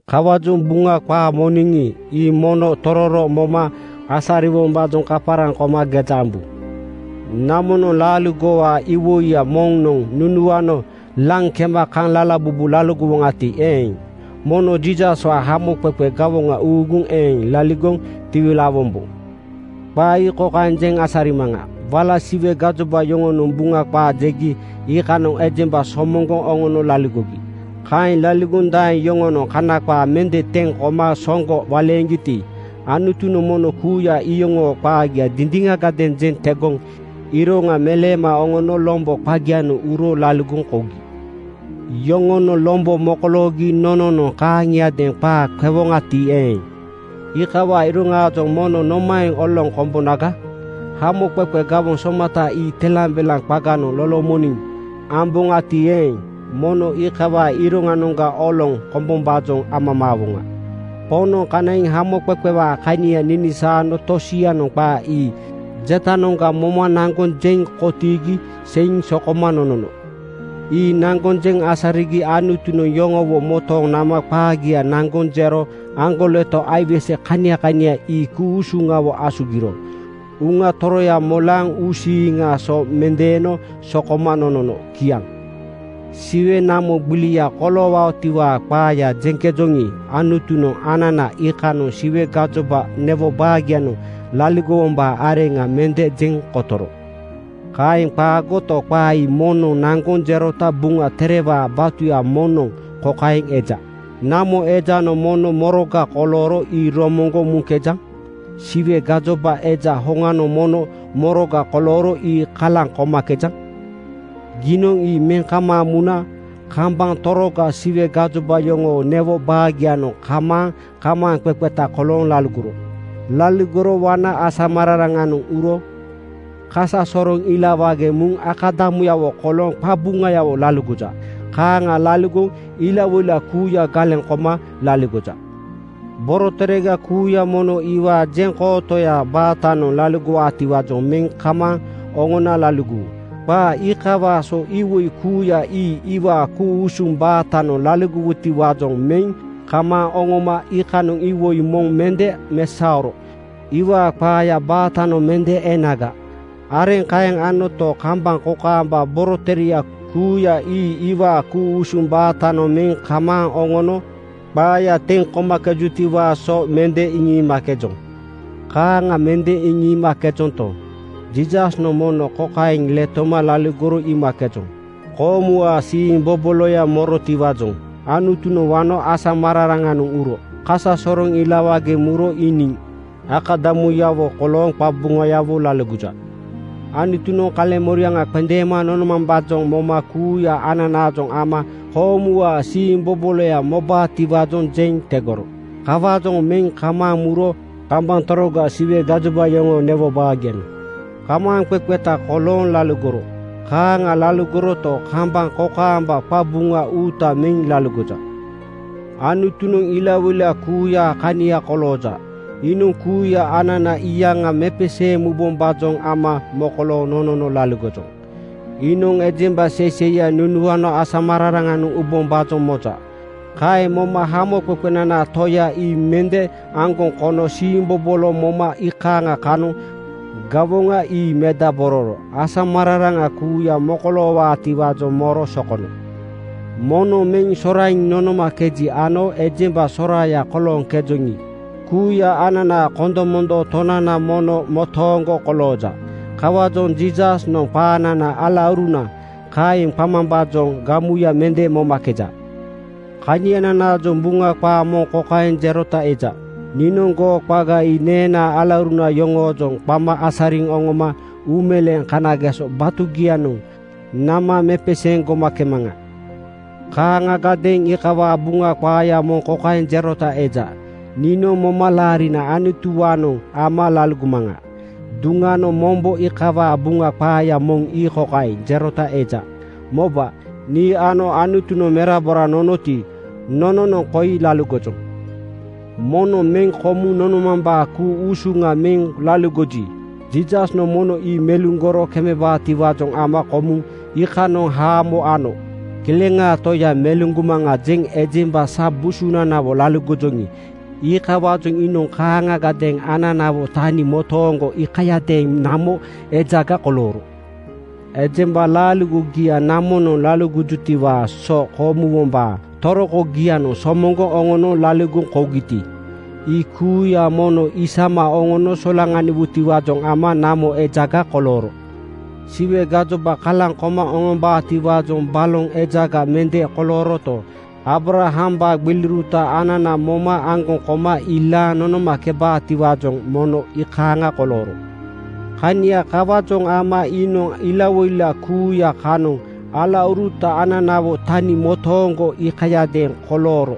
Kawaajoŋ Buŋa qaa moniŋi, ii mono tororo moma asariwombaajoŋ kaparaŋ koma geja ambu. Namonoŋ laaligowaa iwoiya moŋnoŋ nunuano laŋ kema kaŋ lalabubu laligowoŋati eeŋ, mono Jiisaswaa hamoqeqe gawoŋa uuguŋ eeŋ laligoŋ tiwilaawombo. Qaa ii kokaeŋ jeŋ asarimaŋa: Wala Siwe gajoba yoŋonoŋ Buŋa qaa jegi iikanoŋ ejemba somoŋgoŋ oŋono laligogi. Kaeŋ laligoŋ daeŋ yoŋonoŋ Kana qaa mende teŋ koma soŋgo waleeŋgiti, Anutunoŋ mono kuuya iyoŋoo qaagia dindiŋagadeeŋ jeŋ tegoŋ iroŋa meleema oŋono lombo qagianoŋ uro laligoŋ kougi. Yoŋonoŋ lombo mokoloogi nononoŋ kaaŋiadeeŋ qaa qewoŋati eeŋ, iikawaa iroŋaajoŋ mono nomaeŋ oloŋ kombonaga? Hamoqeqe gawoŋ somata ii telambelaŋ qaganoŋ lolomoniŋ amboŋati eeŋ, mono iikawaa iroŋanoŋga oloŋ kombombaajoŋ amamaawoŋa. Poŋnoŋ kanaiŋ hamoqeqewaa kania iŋisaano tosianoŋ qaa ii jetanoŋga moma naŋgoŋ jeŋ kotiigi seiŋ sokoma nonono. Ii naŋgoŋ jeŋ asarigi Anutunoŋ yoŋowo motooŋ nama qaagia naŋgoŋ jero aŋgoleto aiwese kania kania ii ku-usuŋawo asugiro Uŋa Toroya molaaŋ uusiiŋaa so mendeeno sokoma nonono. Kiaŋ. Siwe namo gbilia koloowutiwaa qaaya jeŋkejoŋi, Anutunoŋ anana iikanoŋ Siwe gajoba newo baagianoŋ laligowombaa areŋa mende jeŋ kotoro. Kaeŋ qaagoto, qaa ii moŋnoŋ naŋgoŋ jerota Buŋa Terewaa batuya moŋnoŋ kokaeŋ eja, “Namo ejanoŋ mono moroga kolooro ii romoŋgoŋ muŋkejaŋ? Siwe gomambaa Eja hoŋanoŋ mono moroga kolooro ii kalaŋ komakejaŋ? Giinoŋ ii meŋ kamaaŋ muna kambaŋ toroga Siwe gajoba yoŋoo newo baagianoŋ kamaaŋ kamaaŋqeqeta kolooŋ laligoro. Laligoro wana asamararaŋanoŋ uro kasasoroŋ ilawage muna akadamuyawo kolooŋ qabuŋayawo laligoja. Kaaŋa laligoŋ ilawoila kuuya galeŋ koma laligoja. Boroterega kuuya mono iwaa jeŋkootoyaa baatanoŋ laligowutiwaajoŋ meŋ kamaaŋ oŋona laligowu.” Qaa iikawaa so iwoi kuuya ii iwaa ku-usuŋ baatanoŋ laligowutiwaajoŋ meŋ kamaaŋ oŋoma iikanoŋ iwoi moŋ mende mesaoro iwaa qaayaa baatanoŋ mende enaga. Areŋ kaeŋ anoto, kambaŋ kokaamba borotereya kuuya ii iwaa ku-usuŋ baatanoŋ meŋ kamaaŋ oŋono qaaya teŋ komakejutiwaa so mende iŋiimakejoŋ. Kaaŋa mende iŋiimakejonto, Jiisasnoŋ mono kokaeŋ letoma laligoro iimakejoŋ: Koomuwaa siimboboloya morotiwaajoŋ Anutunoŋ wano asamararaŋanoŋ uro kasasoroŋ ilawage muro iiniŋ akadamuyawo kolooŋ qabuŋayawo laligoja. Anutunoŋ kaleŋmoriaŋa qendeema nonomambaajoŋ moma kuuya ananaajoŋ ama koomuwaa siimboboloya mobaatiwaajoŋ jeŋ tegoro. Kawaajoŋ meŋ kamaaŋ muro kambaŋ toroga Siwe gajoba yoŋoo newo baagianoŋ kamaaŋ kamaaŋqeqeta kolooŋ laligoro. Kaaŋa laligoroto, kambaŋ kokaamba qabuŋa uuta meŋ laligoja. Anutunoŋ ilawoila kuuyaa kania kolooja. Iinoŋ kuuya anana iyaŋa mepeseeŋ mubombaajoŋ ama mokolooŋ nonono laligojoŋ. Iinoŋ ejemba seiseiya nunuano asamararaŋanoŋ ubombaajoŋ moja. Kaeŋ moma hamoqeqenanaa Toya ii mende aŋgoŋ kono siimbobolo moma iikaaŋa kanoŋ gawoŋa ii medabororo asamararaŋa kuuya mokoloowaatiwaajoŋ moro sokono. Moŋnoŋ meŋ soraiŋ nonomakeji ano ejemba soraaya kolooŋkejoŋi, kuuya ananaa kondomondoo Tonananoŋ mono motooŋgo kolooja. Kawaajoŋ Jiisasnoŋ qanana “Alauruna,” kaeŋ qamambaajoŋ gamuya mende momakeja. Kaniananaajoŋ Buŋa qaa moŋ kokaeŋ jerota eja, “Niinoŋ goo qaga ii neenaa alauruna yoŋoojoŋ qama asariŋ oŋoma uumeleeŋ kanageso batugianoŋ nama mepeseeŋ gomakemaŋa.” Kaaŋagadeeŋ iikawaa Buŋa qaaya moŋ kokaeŋ jerota eja, “Niinoŋ momalaarina Anutuwaanoŋ ama laligomaŋa.” Duŋanoŋ mombo iikawaa Buŋa qaaya moŋ ii kokaeŋ jerota eja, “Moba, nii ano Anutunoŋ merabora nonoti, nononoŋ koi laligojoŋ.” Moŋnoŋ meŋ komuŋ nonomambaa ku-usuŋa meŋ laligoji, Jiisasnoŋ mono ii meluŋgoro kemebaatiwaajoŋ ama komuŋ iikanoŋ haamo ano. “Kileŋaa Toya meluŋgomaŋa,” jeŋ ejemba sa busunanawo laligojoŋi, iikawaajoŋ iinoŋ kaaŋagadeeŋ ananawo tani motooŋgo iikayadeeŋ namo ejaga kolooro. Ejemba laaligogia namonoŋ laligojutiwaa so komuwombaa torokogianoŋ somoŋgoŋ oŋono laligoŋ kougiti, ii kuuya mono isama oŋono solaŋaniwutiwaajoŋ ama namo ejaga kolooro. Siwe gajoba kalaŋ koma oŋombaatiwaajoŋ baloŋ ejaga mende kolooroto, Aabrahambaa gbiliuruta anana moma aŋgoŋ koma ilaaŋ nonomakebaatiwaajoŋ mono iikaaŋa kolooro. Kania kawaajoŋ ama iinoŋ ilawoila kuuya kanoŋ alauruta ananawo tani motooŋgo iikayadeeŋ kolooro.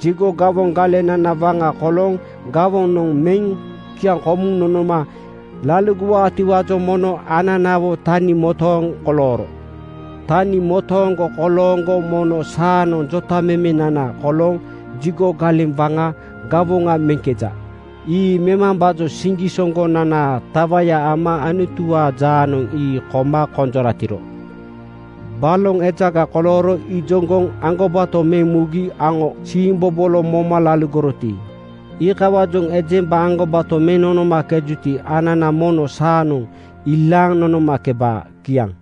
Jigo gawoŋ galenana waŋa kolooŋ gawoŋa noŋ meŋ kiaŋkomuŋ nonoma laligowaatiwaajoŋ mono ananawo tani motooŋ kolooro. Tani motooŋgo kolooŋgo mono saanoŋ jotamemenana kolooŋ jigo galeŋ waŋaa gawoŋa meŋkeja. Ii memambaajoŋ siŋgisoŋgonanaa tawaya ama Anutuwaa jaanoŋ ii koma konjoratiro. Baloŋ ejaga kolooro ijoŋgoŋ aŋgobato meŋ mugi aŋo siimbobolo moma laligoroti, iikawaajoŋ ejemba aŋgobato meŋ nonomakejuti, anana mono saanoŋ ilaaŋ nonomakebaa. Kiaŋ.